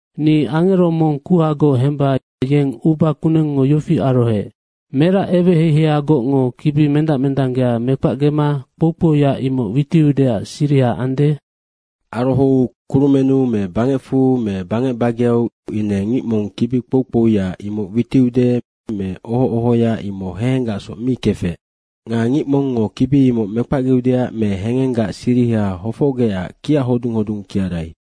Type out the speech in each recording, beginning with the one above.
Ni angero mong kuhagoc hemba yeng uba kunengngo yofi arohoec, “Merac eweheiheiagocngo kibi mendac mendanggea mekpacgema kpou kpouya imoc witiudeac siriha ande?” Arohou kurumennu me bangecfu me bangec bageau ine ngic mong kibi kpou kpouya imoc witiude me oho ohoya, imoc hehenggacsoc mi kefec. Nga ngic mongngo kibi imoc mekpacgeudeac me hengenggac siriha hofocgecac kiachodung hodung kiarai.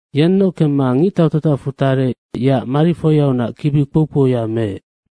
Yennoc kemma ngictau tatacfu tarec, yeac marifoiaunac kibi kpou kpouya meec.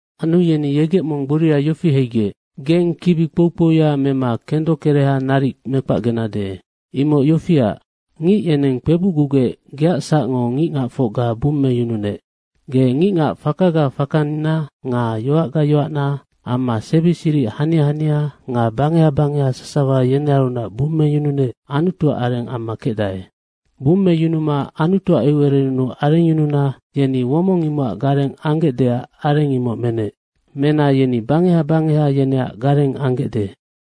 Anu yeni yegec mong gboria yofi heigec, “Geng kibi kpou kpouya mema kendokereha naric mekpacgenade. Imoc yofiac, ngic yeneng kpebucgugec geac sacngo ngicngacfocga bummeyununec. Ge ngicngac fakaga fakangina nga yoacga yoacna amma sebi siric hania hania nga bangeha bangeha sasawa yenearunac bummeyununec Anutuac areng amma kecdae. Bummeyunuma Anutuac eucererennu arengyununa yeni womong imocac gareng anggecdeac areng, imoc menec. Mena yeni bangeha bangeha yeneac gareng anggecde.”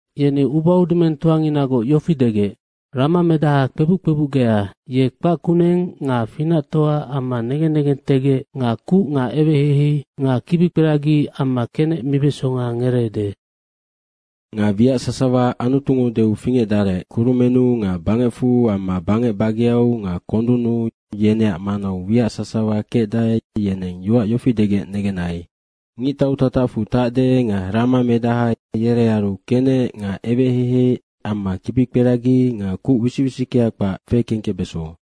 Yeni ubaudumengtoanginagoc yofi degec, “Ramamedaha kpebuc kpebucgea, ye kpac kuneng nga finactoa amma negen negentegec nga kuc nga eweheihei nga kibikperagi amma kenec mibesonga ngereede.” Nga wiac sasawa Anutungo deu fingecdarec kurumennu nga bangecfu amma bangec bageau nga kondunnu, yeneac manau wiac sasawa kecdae, yeneng yoac yofi degec negennai, “Ngictau tatacfu tacde nga ramamedaha, yerearu kenec nga eweheihei amma kibikperagi nga kuc wisic wisickea kpac fekengkecbeso.”